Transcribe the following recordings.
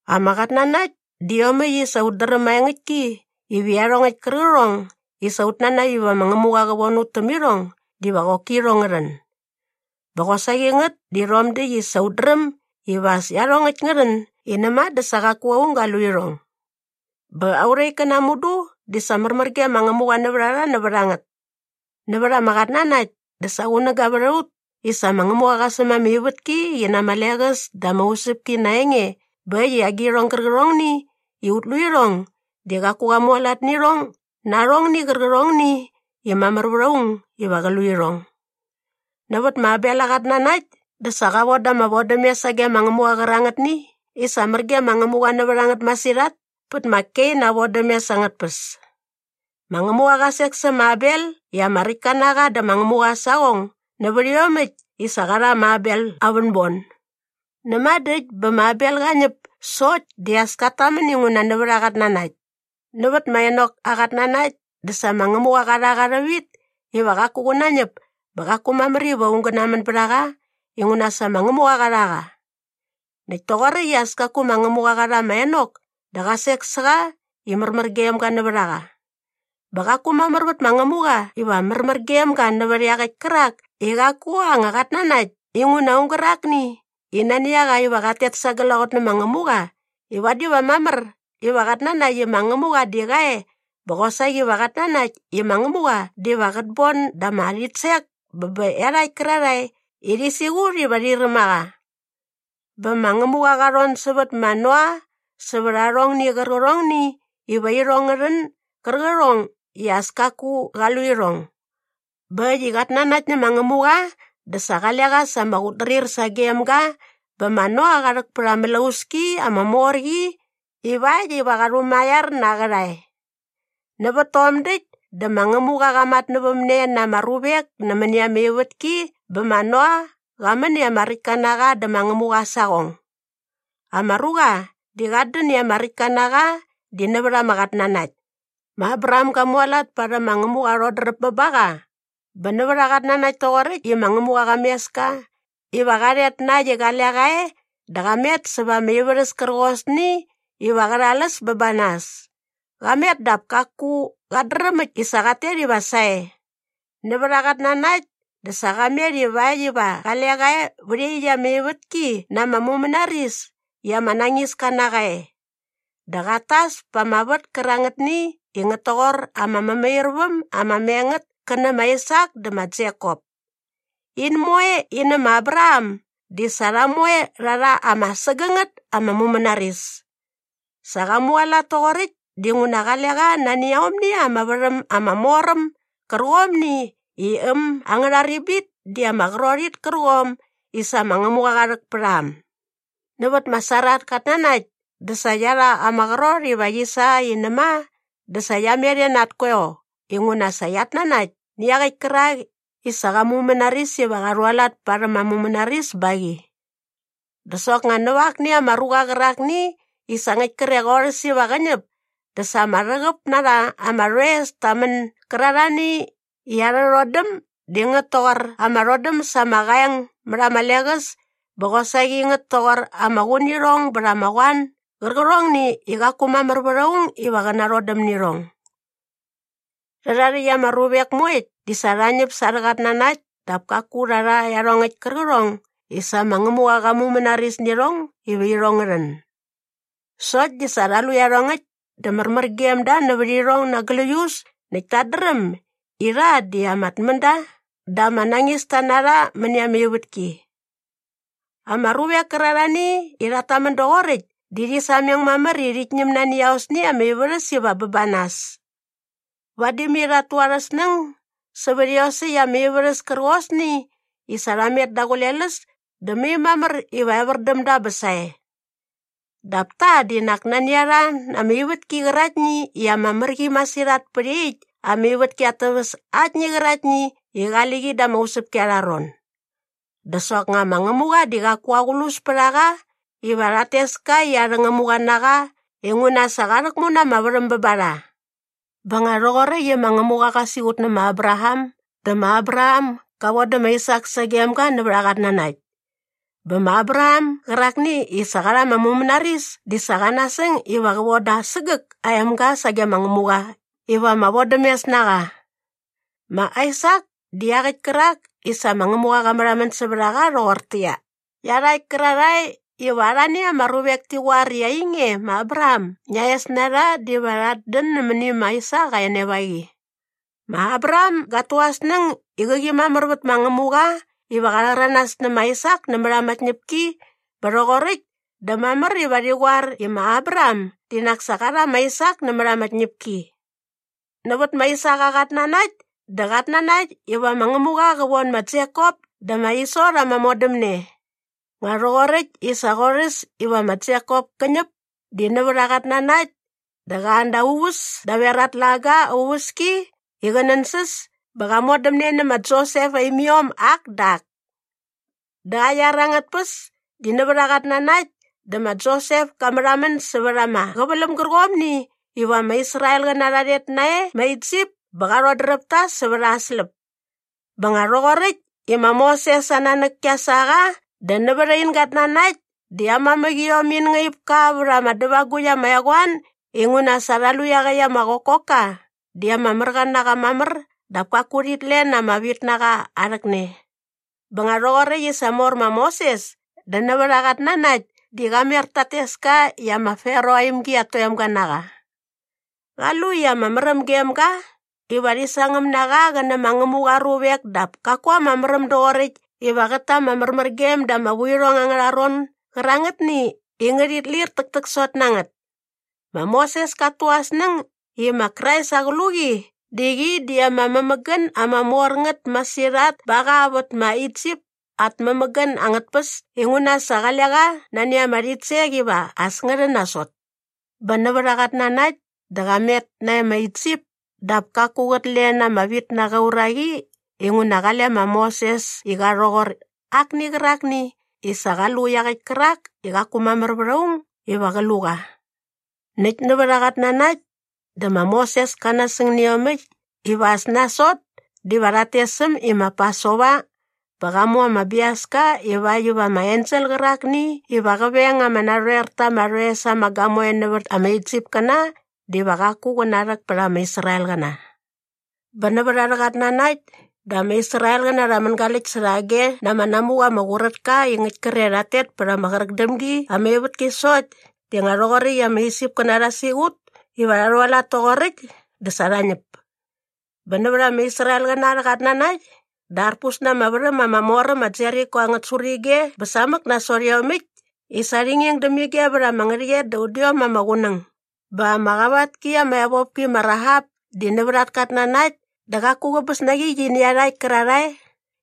Ama qatnanakt di iomäkt i sa ut dräm maengäktki iva iarhongäkt kärqärhong i sa ut nanakt iva ma Ngämuqa qä von ut täm irhong diva qoki irhong ngä rhän. Bä qosaqi ngät di rhom däkt i sa ut dräm iva as iarhongäkt ngä rhän i näma dä sa qaku aung ga lu irhong. Bä aurha ikkäna mudu di sa märmär ge ma Ngämuqa nävät a rha nävät a ngät. Nävät ama qatnanakt di sa qunäga vät a ut i sa ma Ngämuqa qa säm ama ivätki qi na ama leqäs dä ama usäpki na aa enge bä äkt i agirhong gärqärhongni i ut lu irhong di qaku qa mualat nä irhong na arhongni qärqärhongni i mamär vät aung iva qä lu irhong. Nävät ma Abel aa qatnanakt dä sa qa von da ama vodämes sage ma Ngämuqa qärangätni i sa mär gem ma Ngämuqa nävät a ngät masirhat pät ma Kein aa vodämes angät tpäs. Ma Ngämuqa qa sek sä ma Abel i ama räktka na qa dä ma Ngämuqa aa saqong nävät iomäkt i sa qa rha ma Abel aa vänbon. Näma dä äkt bä ma Abel qa ñäp sokt di as kat tamän inguna nävät aa qatnanakt. Nävät ma Enok aa qatnanakt dä sa ma Ngämuqa qa rha qa rhävit ivakt iva qaku qä nañäp bä qaku mamär iva aung gä namän bät a qa inguna sa ma Ngämuqa qa rha qa. Näkt toqoräkt i as kaku ma Ngämuqa qa rha ma Enok dä qa sek sä qa i märmär gem ga nävät a qa. Bä qaku mamär vät ma Ngämuqa iva märmär gem ga nävät iaqäkt kärak i qaku aa anga qatnanakt inguna aung gärakni i nani a qa iva qat tet sa glaqot nä ma Ngämuqa di vadi va mamär iva qat nanakt i ma Ngämuqa di qa e bä qosaqi va qat nanakt i ma Ngämuqa diva qät bon da ama rhitsek bä bä iarhakt kärarhae i rhi siqut iva rhi räm a qa. Bä ma Ngämuqa qa rhon sävät ma Noa sävät arhongni qärqärhongni iva irhong ngä rhän gärqärhong i as kaku qa lu irhong. Bä äkt i qa nanakt nä ma Ngämuqa dä sa qale qa sa ama qutdrir sagem ga bä ma Noa qa rhäk pät ama mlauski ama mor qi ivakt iva qa rhumaiar na aa qärhae. Nävät tom däkt dä ma Ngämuqa qa matnävämne na ama ruvek nämäni ama ivätki bä ma Noa qa män i ama räktka na qa dä ma Ngämuqa aa saqong. Ama ruqa di qat dän i ama räktka na qa di nävät ama qatnanakt. Ma Abraham ga mualat parhäm ma Ngämuqa aa rhodräp bä ba qa bä nävät aa qatnanakt toqoräkt i ma Ngämuqa qa mes ka iva qa rhet na äkt i qale qa e dä qa met säva ama ivärhäs kärqosni iva qä rhal äs bä ba nas. Qa met dap kaku qat dräm äkt i sa qat tet iva sae. Nävät aa qatnanakt dä sa qa met ivakt iva qale qa vä iaqyäkt ama ivätki na ama mumänaris i ama nañiska na qa e. Dä qat tas pa ama vät kärangätni i ngät toqor ama mämairväm ama me ngät kä nä na Aisak dä ma Jekop. In moe in nä ma Abraham di sa rha moe rha rha ama sägängät ama mumänaris. Sa qa mualat toqoräkt dinguna qale qa nani aomni ama värhäm ama mor äm gärqomni i äm angärha ribit di ama qrot it kärqom i sa ma Ngämuqa qa rhäk pät a äm. Nävät ma Sara at katnanakt dä sa qia rha ama qrot iva qi sa i näma dä sa qia met e na at koeo inguna sa qiat nanakt nä iaqäkt kärakni i sa qa mumänaris iva qa rhualat parhäm aa mumänaris ba qi. Dä soknga näva akni ama ruqa qärakni i sa ngäkt kre qorhäs iva qä ñäp dä sa ama rhäqäp na rha ama rhoes ta män gärarhani i arhä rhodäm di ngät toqor ama rhodäm sa ama qaeng mät ama leqäs bä qosaqi ngät toqor ama qunirhong bät ama qoan gärqärhongni i qaku mamär vät aung iva qä narhodäm nä irhong. Rhärha rhäkt ama ruvek moekt di sa rha ñäp sa arhä qatnanakt dap kaku rha rha iarhongäkt kärqärhong i sa ma Ngämuqa qa mumänaris nä irhong iva irhong ngä rhän. Sokt di sa rha lu iarhongäkt dä märmär gem da nävät irhong na gläius näkt tat dräm i rha di ama tmända dä ama nañista na rha mäni ama ivätki. Ama ruvek kärarhani i rhat tamän doqoräkt di rhi sameng mamär i rhit ñäm nani aosni ama ivärhäs iva bä ba nas. Vadi mai rhat tu arhä snäng sävät iosäkt ama ivärhäs kärqosni i sa rha met daqule läs dä mai mamär iva evär däm da bä sae. Dap ta di nak nani a rha na ama ivätki qäraktni i ama mär qi masirhat pät iaqyäkt ama ivätki at täväs aktni qäraktni i qali qi da ama usäpki arha ron. Dä soknga ma Ngämuqa di qaku aqlus pät a qa iva rhat tes ka i arhä Ngämuqa na qa inguna sa qa rhäkmu na ama värhäm bä ba rha. Bä nga rhoqoräkt i ma Ngämuqa qa siqut nä ma Abraham dä ma Abraham ga vodä ma Aisak sagem ga nävät aa qatnanakt. Bä ma Abraham gärakni i sa qa rha ama mumänaris di sa qä nasäng iva qä voda aa sägäk aa emga sage ma Ngämuqa iva ama vodämes na qa. Ma Aisak di iaqäkt kärak i sa ma Ngämuqa qa märhamän sävät a qa rhoqortäqyia, “Iarhakt kärarhae iva arhani ama ruvek ti qoar i ainge ma Abraham ngia es na rha diva rhat dän nämäni ma Aisak aa enevaqi.” Ma Abraham gat tu aa snäng i qäqi mamär vät ma Ngämuqa iva qa rhäranas nä ma Aisak nämät ama tñäpki bä rhoqoräkt dä mamär iva rhi qoar i ma Abraham di nak sa qa rha ma Aisak nämät ama tñäpki. Nävät ma Aisak aa qatnanakt dä qat nanakt iva ma Ngämuqa qä von ma Jekop dä ma Iso rha ama modämne. Nga rhoqoräkt i sa qorhäs iva ma Jekop kä ñäp di nävät aa qatnanakt dä qa an da aa uväs daver aa tlaga aa uväski i qä nänsäs bä qa modämne nä ma Josep aa imiom ak dä ak. Da aa iar angät tpäs di nävät aa qatnanakt dä ma Josep ka märhamän sävät ama qäväläm gärqomni iva ama Israelqäna rha rhet nae ma Isip bä qa rhodräp ta sävät aa släp. Bä nga rhoqoräkt i ma Moses aa nanäk kia sa qa dä nävät ain gatnanakt di aa mamäqiom in ngaip ka vät ama dävagukt ama eqoan inguna sa rha lu i iaqäkt ama qokokka di ama märqa na qa mamär dap kaku rhit len ama vitnaqa aa rhäkne. Bä nga rhoqoräkt i sa mor ma Moses dä nävät aa qatnanakt di qa mer tat tes ka i ma Farao aa imgi at toemga na qa. Qa lu i ama märäm gem ga iva rhi sangäm na qa qä nä ma Ngämuqa aa ruvek dap kaku ama märäm doqoräkt iva qät ta ama märmärgem da ama vuirhong angärha ron gärangätni i ngärhit lir täktäksot na ngät. Ma Moses kat tu aa snäng i ma Krais aa qluqi di qi di ama mämägän ama mor ngät masirhat ba qa vät ma Isip at mämägän angät tpäs inguna sa qale qa nani ama rhitsek iva as ngä rhän nasot. Bä nävät aa qatnanakt dä qa met nae ma Isip dap kaku qät len ama vitnaqa aa uraqi inguna qale ma Moses i qa rhoqor akni qärakni i sa qa lu iaqäkt kärak i qaku mamär vät aung iva qä lu qa. Näkt nävät aa qatnanakt dä ma Moses ka nasäng nä iomäkt iva as nasot diva rhat tes äm i ma Pasova bä qa mu ama biaska ivakt iva ama ensel qärakni iva qä veng ama narhoer ta ama rhoes ama gamoe nävät ama Isipkäna diva qaku qä narhäk pät ama Israelqäna. Bä nävät arhä qatnanakt dä ama Israelqäna rha mängaläkt särhage na ama namuqa ma Qurätka i ngäkt kre rhat tet pät ama qräk däm gi ama ivätki sokt di nga rhoqoräkt i ama Isipkäna rha siqut iva rha rhualat toqoräkt dä sa rha ñäp. Bä nävät ama Israelqäna arhä qatnanakt dä arpus na ama värhäm ama mor äm ma Jeriko angät surige bä samäk nasot iomäkt i sa rhi nging däm ige vät ama ngärhäqyet da udiom ama qunäng. Bä ama qavat ki ama evopki ma Rahap di nävät at katnanakt dä qaku qäbäs na qi qi nä iarhakt kärarhae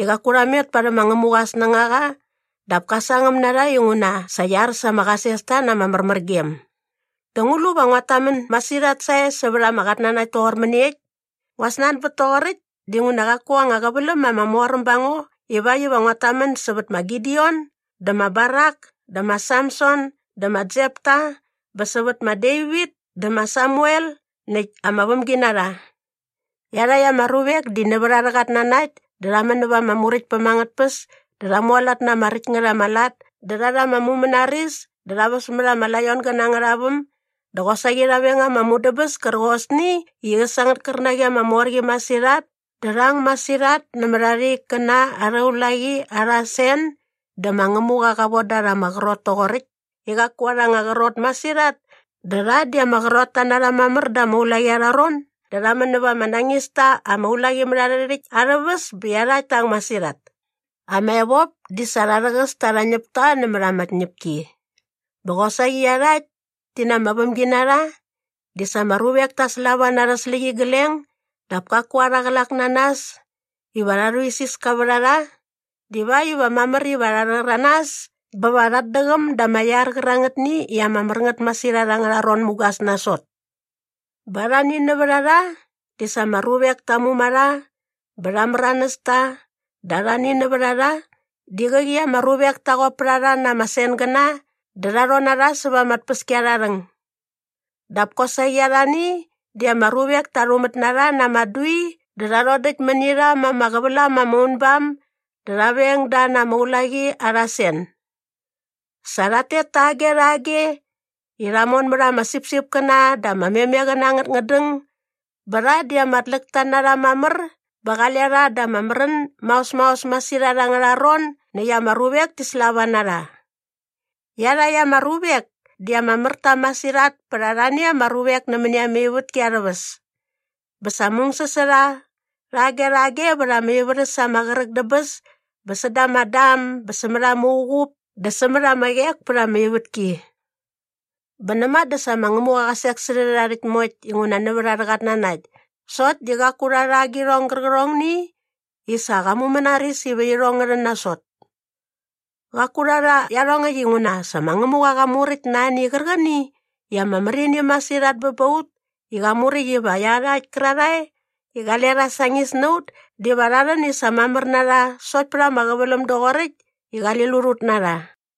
i qaku rha met parhäm ma Ngämuqa aa snängaqa dap ka sangäm na rha inguna sa qia ar sa ama qasesta na ama märmärgem. Dä ngu lu va nguat tamän masirhat sae sävät ama qatnanakt toqor mäniekt? Ngua snanbät toqoräkt dinguna qaku anga qäväläm ama mor äm ba ngo ivakt iva nguat tamän sävät ma Gideon dä ma Barak dä ma Samson dä ma Jepta bä sävät ma Devit dä ma Samuel näkt ama vämginarha. Iarhakt ama ruvek di nävät arhä qatnanakt dä rha män näva ama muräktpäm angät tpäs dä rha mualat na ama räkt ngät ama lat dä rha rha ama mumänaris dä rha väs mät ama laiongäna angärha väm dä qosaqi rha veng ama mudäbäs kärqosni i äs angät kärnaqi ama mor qi masirhat dä rha ang masirhat nämät arha ikkäna arha ulaqi arha sen dä ma Ngämuqa qa von da rha ama qrot toqoräkt i qaku arha anga qrot masirhat dä rha di ama qrotta na rha mamär da ama ulaqi arha ron dä rha män näva ama nañis ta ama ulaqimärharhärhäkt arhä väs bä iarhakt ta ang masirhat. Ama evop di sa rha rhäqäs ta arhä ñäpta nämät ama tñäpki. Bä qosaqi iarhakt ti na ama vämginarha di sa ama ruvek ta slava na arhä släqyigleng dap kaku arha qlak na nas iva rha rhuisiska vät a rha divakt iva mamär iva rha rhäranas bä va rhat däqäm da ama iar qärangätni i ama mär ngät masirhat angärha ron mugas nasot. Bä arhani nävät a rha di sa ama ruvek ta muma rha bä rha märanäs ta dä arhani nävät a rha di qäqi ama ruvek ta qop pät a rha na ama sengäna dä rha rhon na rha säva ama tpäskiarharhäng. Dap kosaqi arhani di ama ruvek ta rhumät na rha na ama dui dä rha rhodäkt mäni rha ma ama qävälam ama unbam dä rha veng da na ama ulaqi arha sen. Sa rhat tet tage rhage i rha mon mät ama sipsipkäna dä ama memeqäna angät ngädäng bä rha di ama tläkta na rha mamär bä qale rha da ama märän maos maos masirhat angärha ron näkt ama ruvek ti slava na rha. Iarhakt ama ruvek di ama mär ta masirhat pät arhani ama ruvek nämäni ama ivätki arhä väs. Bä sa mungsäs sa rha rhage rhage vät ama ivärhäs ama qräk dä bäs bä säda ama dam bä sämät ama uqup dä sämät ama qek pät ama ivätki. Bä näma dä sa ma Ngämuqa qa sek sä rhärha rhäkt moekt inguna nävät arhä qatnanakt sokt di qaku rha rha agirhong gärqärhongni i sa qa mumänaris iva irhong ngä rhän nasot. Qaku rha rha iarhongäkt inguna sa ma Ngämuqa qa muräkt na ani qärqäni i ama mär ini masirhat bä ba ut i qa muräkt iva iarhakt kärarhae i qale rha sañis na ut diva rha rhän i sa mamär na rha sokt pät ama qäväläm doqoräkt i qali lut ut na rha.